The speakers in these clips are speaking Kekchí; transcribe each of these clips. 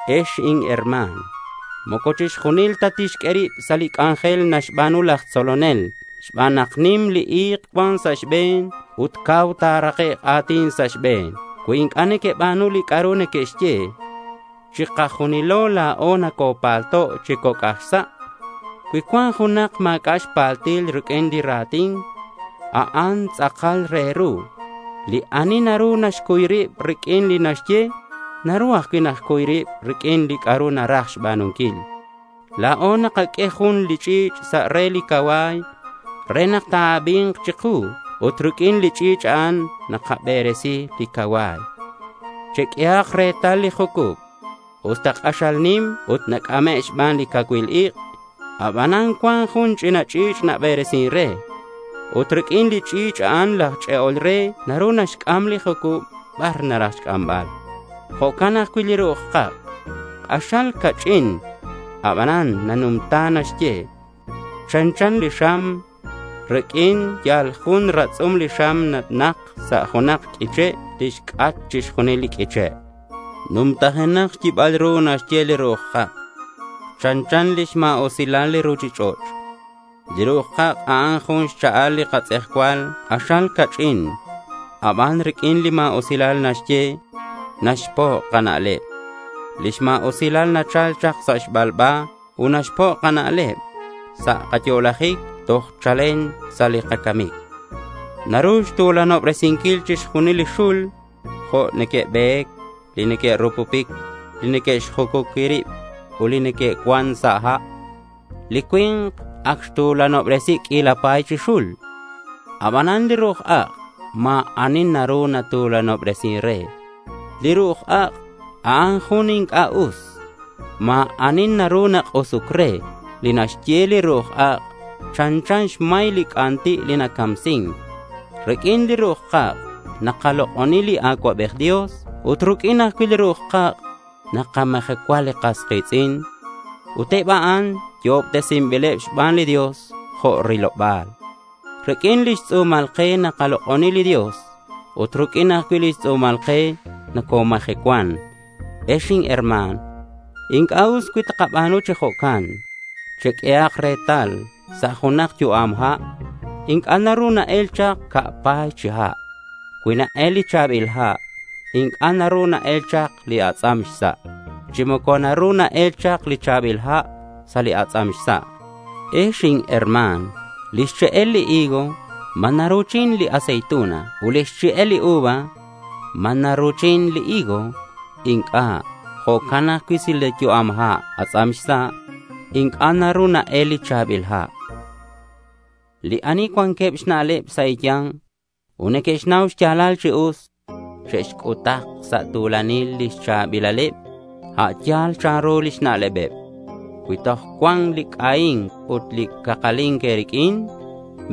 Ex inherma̱n, moco chixjunil ta te'xq'ue rib sa' li c'anjel naxba̱nu laj tzolonel xban nak nim li i̱k cuan sa' xbe̱n ut cau ta̱rakek' a̱tin sa' xbe̱neb cui inc'a' neque'xba̱nu li c'a'ru neque'xye. Chikajunilo la̱o nocopalto' chi coc' aj sa'. Cui cuan junak ma̱c'a' xpaltil riq'uin li ra̱tin, a'an tz'akal re ru. Li ani naru naxcuy rib riq'uin li naxye, naru ajcui' naxcuy rib riq'uin li c'a'ru naraj xba̱nunquil. La̱o nakaq'ue jun li ch'i̱ch' sa' re li cacua̱y re nak ta̱abi̱nk chiku ut riq'uin li ch'i̱ch' a'an nakaberesi li cacua̱y. Cheq'uehak retal li jucub. Usta k'axal nim ut nac'ame' xban li cacuil ik', aban cuan jun ch'ina ch'i̱ch' naberesin re. Ut riq'uin li ch'i̱ch' a'an laj ch'e'ol re naru naxc'am li jucub bar naraj xc'ambal. Jo'can ajcui' li ru'uj ak'. K'axal ca'ch'in aban nanumta naxye. Chanchan li xam. Riq'uin yal jun ratz'um li xam ta̱nak sa' junak q'uiche' tixc'at chixjunil li q'uiche'. Numtajenak xyibal ru naxye li ru'uj ak'. Chanchan lix ma̱usilal li ruchich'och'. Li ru'uj kak', a'an jun xcha'al li katz'ejcual k'axal ca'ch'in; aban riq'uin li ma̱usilal naxye, naxpo' kana'leb. Lix ma̱usilal nachal chak sa' xbalba ut naxpo' kana'leb sa' kayo'lajic toj chalen sa' li kacamic. Naru xtu̱lanobresinquil chixjunil li xul, jo' li neque'be̱c, li neque'rupupic, li neque'xjucuqui rib ut li neque'cuan sa' ha'. Li cui̱nk ac xtu̱lanobresi q'uila pa̱y chi xul. Aban li ru'uj ak' ma̱ ani naru natu̱lanobresin re. Li ru'uj ak', a'an jun li inc'a' us. Ma̱ ani naru nak'usuc re. Li naxye li ru'uj ak' chanchan xmay li c'anti' li nacamsin. Riq'uin li ru'uj kak' nakalok'oni li Acuabej Dios ut riq'uin ajcui' li ru'uj kak' nakamajecua li kas ki̱tz'in ut eb a'an yo'obtesinbileb xban li Dios jo' li riloba̱l. Riq'uin lix tz'u̱mal ke nakalok'oni li Dios ut riq'uin ajcui' lix tz'u̱mal ke nocomajecuan. Ex inherma̱n, inc'a' us cui takaba̱nu chi jo'can. Cheq'uehak retal. Sa' junak yu'am ha' inc'a' naru na-el chak ca' pa̱y chi ha'. Cui na-el li cha̱bil ha' inc'a' naru na-el chak li atz'am xsa', chi moco naru na-el chak li cha̱bil ha' sa' li atz'am xsa'. Ex inherma̱n, lix che'el li higo, ¿ma naru naru̱chin li aceituna? Ut lix che'el li uva, ¿ma naru naru̱chin li higo? Inc'a'. Jo'can ajcui' sa' li yu'am ha' atz'am xsa', inc'a' naru na-el li cha̱bil ha'. Li ani cuanqueb xna'leb sa' e̱ya̱nk ut neque'xnau xya̱lal chi us, che'xc'utak sa' tu̱lanil lix cha̱bilaleb a' yal chanru lix na'lebeb. Cui toj cuan li c'ahi̱nc ut li cakali̱nc e̱riq'uin,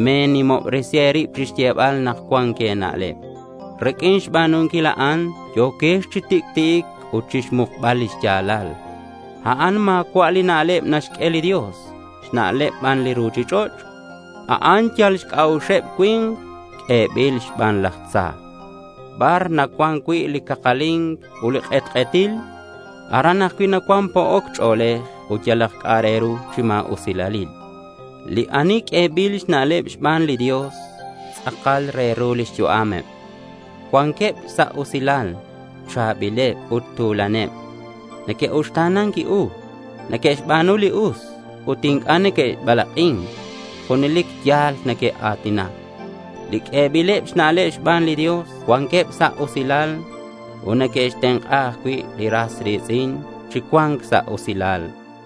me̱nimobresi e̱rib chixyebal nak cuan e̱na'leb. Riq'uin xba̱nunquil a'an yo̱quex chi tic'ti'ic ut xmukbal li xya̱lal. A'an ma̱cua' li na'leb naxq'ue li Dios. Xna'leb ban li ruchich'och'. A'an yal xc'a'uxeb cui̱nk ut q'uebil xban laj tza. Bar nacuan cui' li cakali̱nc ut li k'etk'etil, aran ajcui' nacuan po'oc ch'o̱lej ut yalak c'a'ru chi ma̱usilalil. Li ani q'uebileb xna'leb xban li Dios, tz'akal re ru lix yu'ameb. Cuanqueb sa' usilal, cha̱bileb ut tu̱laneb. Neque'uxta̱nan u, neque'xba̱nu li us, ut inc'a' neque'balak'in. Junelic ya̱l neque'a̱tinac. Li q'uebileb xna'leb xban li Dios cuanqueb sa' usilal ut neque'xtenk'a ajcui' li ras ri̱tz'in chi cua̱nc sa' usilal.